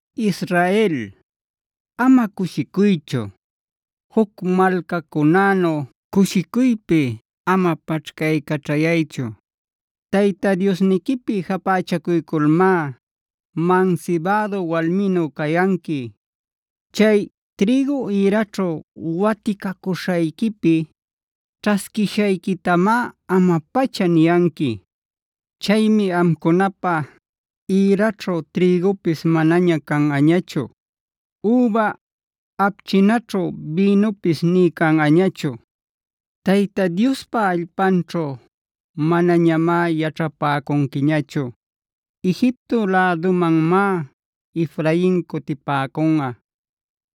Israel, ama cushicuychu. Juc malcacunänu cushicuypi ama paćhcaycaćhayaychu. Tayta Diosniquipi japächacuyculmá mansibädu walminu cayanqui. Chay trïgu ïraćhu waticacuśhayquipi ćhasquishayquitamá ama-pacha niyanqui. Chaymi amcunapä ïraćhu trïgupis manaña canꞌañachu; üba apchinaćhu bïnupis nï canꞌañachu. Tayta Diospa allpanćhu manañamá yaćhapäcunquiñachu. Egipto lädumanmá Efrain cutipäcunꞌa;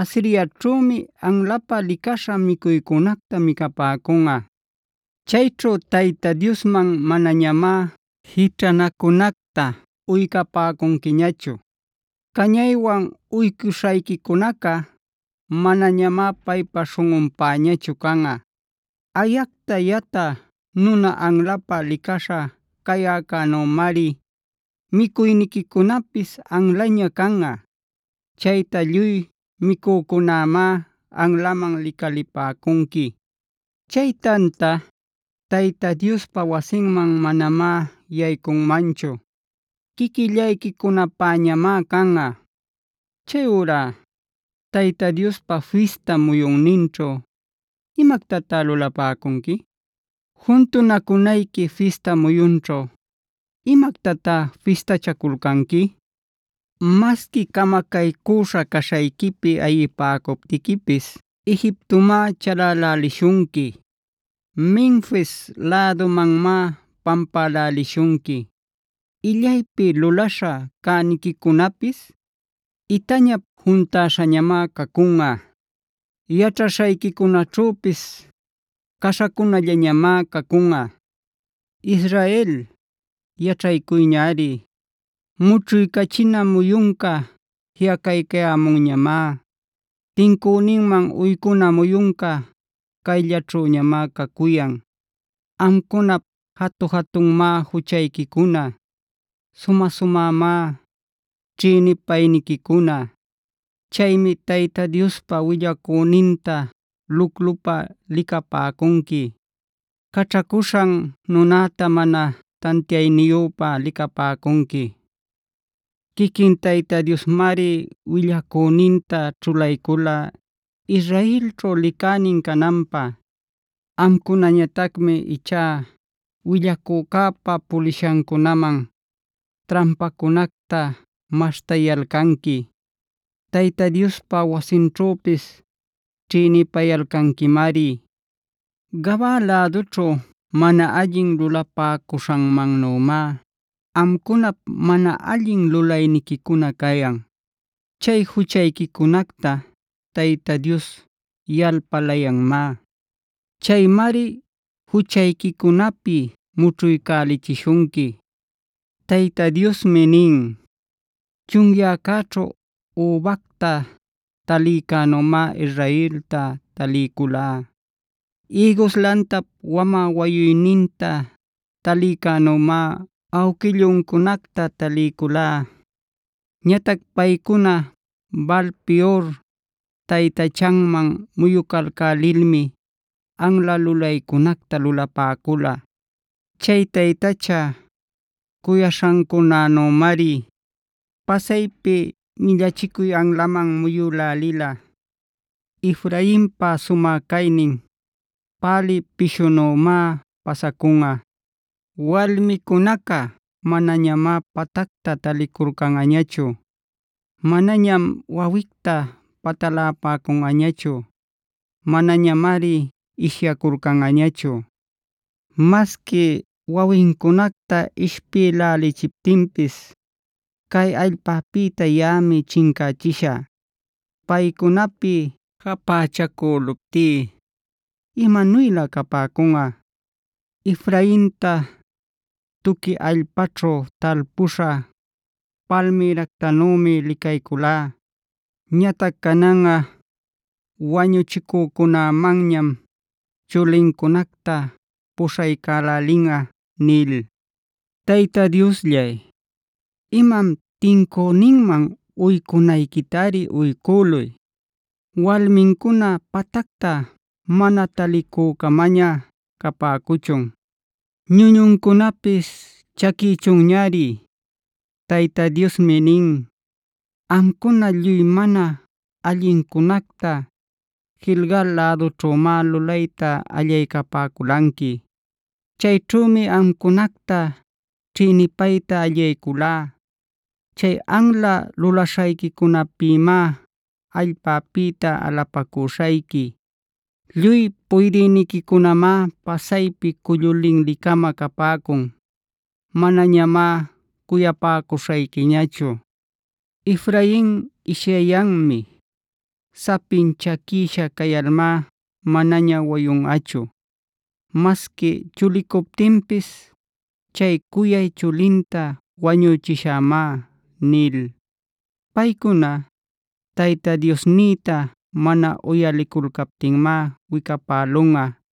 Asiriaćhümi anlapä licaśha micuycunacta micapäcunꞌa. Chayćhu Tayta Diosman manañamá jićhanacunacta uycapäcunquiñachu. Cañaywan uycuśhayquicunaca manañamá paypa śhunꞌunpäñachu canꞌa. Ayacta yatä nuna anlapä licaśha cäyäcänümari micuyniquicunapis anlaña canꞌa. Chayta lluy micücunämá anlaman licalipäcunqui. Chay tanta, Tayta Diospa wasinman manamá yaycunmanchu; quiquillayquicunapäñamá canꞌa. Chayurá Tayta Diospa fista muyunninćhu, ¿imactatá lulapäcunqui? Juntunacunayqui fista muyunćhu, ¿imactatá fistachaculcanqui? Masqui camacaycüśha caśhayquipi ayipäcuptiquipis Egiptomá chalälälishunqui. Menfisa lädumanmá pampälälishunqui. Illaypi luläśha cäniquicunapis itañap juntäśhañamá cacunꞌa. Yaćhaśhayquicunäćhüpis caśhacunallañamá cacunꞌa. Israel, ¡yaćhaycuyñari! ¡Mućhuycachina muyunca jiꞌacaycayämunñamá!b ¡Tincüninman uycuna muyunca cayllaćhüñamá cacuyan! Amcunap jatu-jatunmá juchayquicuna; sumä-sumämá ćhïnipayniquicuna. Chaymi Tayta Diospa willacüninta luclupa licapäcunqui; caćhacuśhan nunäta mana tantiayniyüpa licapäcunqui. Quiquin Tayta Diosmari willacüninta ćhulaycula Israelćhu licänin cananpä.c Amcunañatacmi ichá willacücäpa puliśhancunäman trampacunacta maśhtayalcanqui. Tayta Diospa wasinćhüpis ćhïnipayalcanquimari. Gabaad lädućhu mana allin lulapäcuśhanmannümáe amcunap mana allin lulayniquicuna cayan. Chay juchayquicunacta Tayta Dios yalpalayanmá. Chaymari juchayquicunapi mućhuycälichishunqui. Tayta Diosmi nin: “Chunyäcäćhu übacta talïcänümá Israelta taliyculá. Ïgus lantap wamä wayuyninta talïcänümá awquilluncunacta taliyculá. Ñatac paycuna Baal-peor taytachaman muyucalcälilmi anla lulaycunacta lulapäcula.f Chay taytacha cuyaśhancunänümari pasaypi millachicuy anlaman muyülälila. “Efrainpa sumä caynin pälï pishunümá pasacunꞌa. Walmicunaca manañamá patacta taliculcanꞌañachu. Manañam wawicta patalapäcunꞌañachu; manañamari ishyaculcanꞌañachu. Masqui wawincunacta ishpïlächiptinpis cay allpäpïta yaꞌami chincächishä. Paycunapi japächacüluptí, ¡imanuylä capäcunꞌa! Efrainta tuqui allpaćhu talpüśha palmïractanümi licayculá.g Ñatac cananꞌa wañuchicücunämanñam chulincunacta puśhaycälälinꞌa” nil. Tayta Diosllay, imam tincüninman uycunayquitari uycüluy. Walmincuna patacta mana talicü-camaña capäcuchun; ñuñuncunapis chaquïchunñari. Tayta Diosmi nin: “Amcuna, lluy mana allincunacta Gilgal lädućhümáh lulayta allaycapäculanqui.i Chayćhümi amcunacta ćhïnipayta allayculá. Chay anla lulaśhayquicunapïmá allpäpïta alapacüśhayqui. Lluy puydïniquicunamá pasaypi cullu linli-cama capäcun. Manañamá cuyapäcuśhayquiñachu. Efrain ishyayanmi; sapin chaquïsha cayalmá manaña wayunꞌachu. Masqui chulicuptinpis chay cuyay chulinta wañüchishämá” nil. Paycuna, Tayta Diosnïta mana uyaliculcaptinmá wicapälunꞌa.